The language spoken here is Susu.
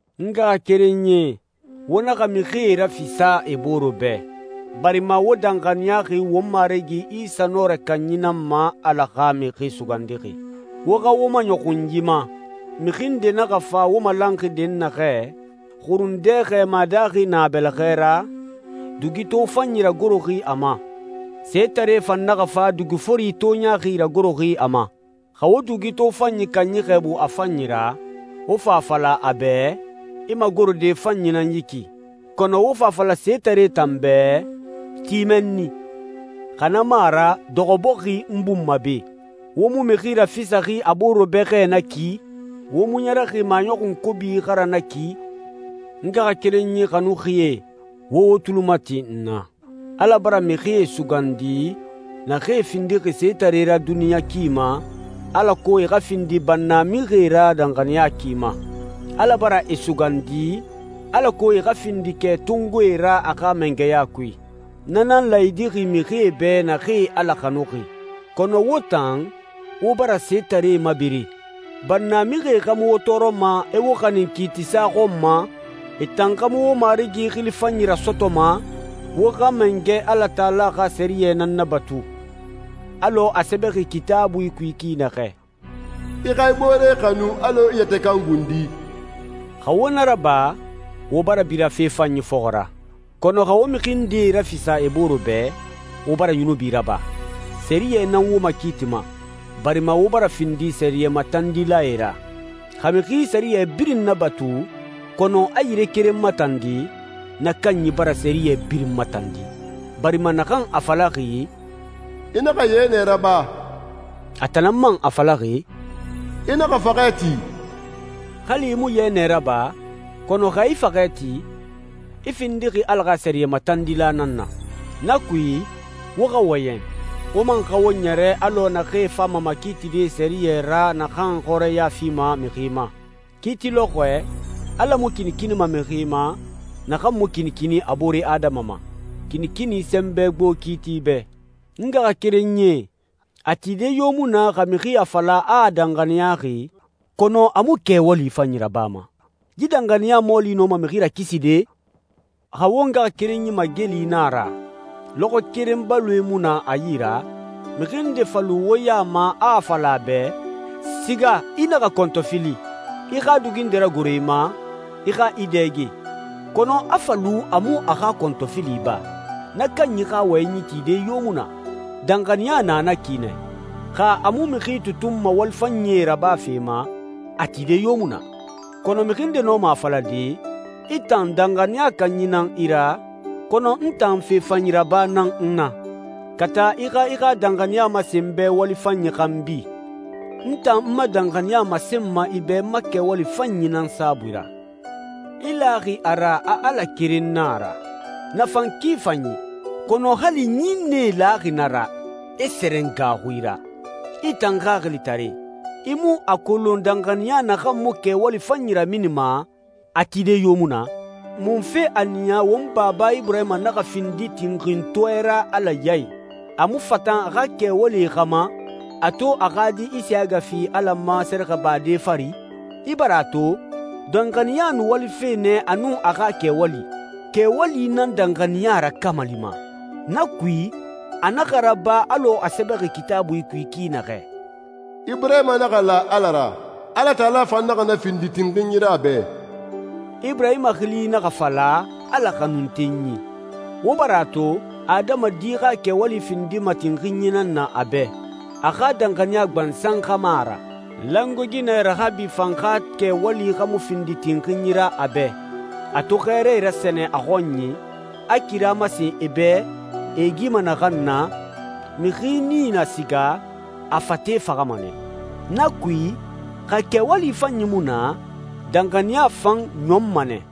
N ngaxakerenyie, wo naxa mixie rafisa e boore bɛ, barima wo danxaniyaxi won Marigi Isa Nɔrɛ Kanyi nan ma, Ala xa Mixi Sugandixi. Wo xa wo maɲɔxun yi ma: Mixi nde naxa fa wo malanxi dɛnnaxɛ, xurundɛ xɛɛma daaxi na a bɛlɛxɛ ra, dugi tofanyi ragoroxi a ma. Setare fan naxa fa, dugi fori toɲaaxi ragoroxi a ma. Xa wo dugi tofanyi kanyi xɛɛbu a fanyi ra, wo fa a fala a bɛ, «I magorode fanyi nan yi ki,» kɔnɔ wo fa a fala setare tan bɛ, «Ti mɛnni,» xa na mu a ra, «Dɔxɔ bɔxi, n bun ma be,» wo mu mixi rafisaxi a boore bɛ xɛ na ki? Wo mu ɲɛrɛxi maɲɔxun kobi xa ra na ki? N ngaxakerenyi xanuxie, wo wo tuli mati n na. Ala bara mixie sugandi naxee findixi setaree ra duniɲa ki ma, alako e xa findi bannamixie ra danxaniya ki ma. Ala bara e sugandi alako e xa findi kɛtongoe ra a xa mangɛya kui. Na nan laayidixi mixie bɛ naxee Ala xanuxi. Kɔnɔ wo tan, wo bara setaree mabere. Bannamixie xa mu wo tɔɔrɔma, e wo xanin kiitisa xɔn ma? E tan xa mu wo Marigi xili fanyi rasɔtɔma? Wo xa Mangɛ Alatala xa sɛriyɛ nan nabatu, alɔ a sɛbɛxi Kitaabui kui ki naxɛ, «I xa i boore xanu alɔ i yɛtɛ kan gundi.» Xa wo na raba, wo bara bira fe fanyi fɔxɔ ra. Kɔnɔ xa wo mixi ndee rafisa e boore bɛ, wo bara yunubi raba. Sɛriyɛ nan wo makiitima, barima wo bara findi sɛriyɛ matandilae ra. Xa mixi sɛriyɛ birin nabatu kɔnɔ a yire keren matandi, na kanyi bara sɛriyɛ birin matandi, barima naxan a falaxi, «I naxa yɛnɛ raba,» a tan nan man a falaxi, «I naxa faxɛ ti.» Hali i mu yɛnɛ raba, kɔnɔ xa i faxɛ ti, i findixi Ala xa sɛriyɛ matandila nan na. Na kui, wo xa wɔyɛn, wo man xa wo ɲɛrɛ alɔ naxee fama makiitide sɛriyɛ ra naxan xɔrɛya fima mixi ma. Kiiti lɔxɔɛ, Ala mu kinikinima mixi ma naxan mu kinikini a boore adama ma. Kinikini sɛnbɛ gbo kiiti bɛ. N ngaxakerenyie, a tide yo mu na xa mixi a fala a a danxaniyaxi, kɔnɔ a mu kɛwali fanyi rabama. Yi danxaniya mɔɔli nɔma mixi rakiside? Xa wo ngaxakerenyi mageli na a ra, lɔxɔɛ keren baloe mu na a yi ra, mixi nde fa lu wo ya ma a a fala a bɛ, «Siga, i naxa kɔntɔfili, i xa dugi nde ragoro i ma, i xa i dɛge,» kɔnɔ a fa lu a mu a xa kɔntɔfili ba, na kanyi xa wɔyɛnyi tide yo mu na. Danxaniya na na ki nɛ. Xa a mu mixi tutunma wali fanyie rabafe ma, a tide yo mu na. Kɔnɔ mixi nde nɔma a falade, «I tan, danxaniya kanyi nan i ra, kɔnɔ n tan fe fanyi raba nan n na.» Kata i xa i xa danxaniya masen n bɛ wali fanyi xanbi. N tan n ma danxaniya masenma i bɛ n ma kɛwali fanyi nan saabui ra. I laxi a ra, a Ala keren na a ra. Na fan ki fanyi, kɔnɔ hali ɲinnɛe laxi na ra, e sɛrɛn gaaxui ra. I tan xaxilitare, i mu a kolon danxaniya naxan mu kɛwali fanyi raminima, a tide yo mu na? Munfe a niya won baba Iburahima naxa findi tinxintɔɛ ra Ala ya i? A mu fatan a xa kɛwalie xa ma, a to a xa di Isiyaga fi Ala ma sɛrɛxɛbade fari? I bara a to, danxaniya nu walife nɛ a nun a xa kɛwali. Kɛwali nan danxaniya rakamalima. Na kui, a naxa raba alɔ a sɛbɛxi Kitaabui kui ki naxɛ, «Iburahima naxa la Ala ra. Alatala fan naxa na findi tinxinyi ra a bɛ.» Iburahima xili naxa fala «Ala xanuntenyi». Wo bara a to, adamadi xa kɛwali findima tinxinyi nan na a bɛ, a xa danxaniya gbansan xa mu a ra. Langoe ginɛ Raxabi fan xa kɛwali xa mu findi tinxinyi ra a bɛ, a to xɛɛrae rasɛnɛ a xɔnyi, a kira masen e bɛ e e gima naxan na? Mixi nii na siga, a fate faxama nɛ. Na kui, xa kɛwali fanyi mu na, danxaniya fan ɲɔnma nɛ.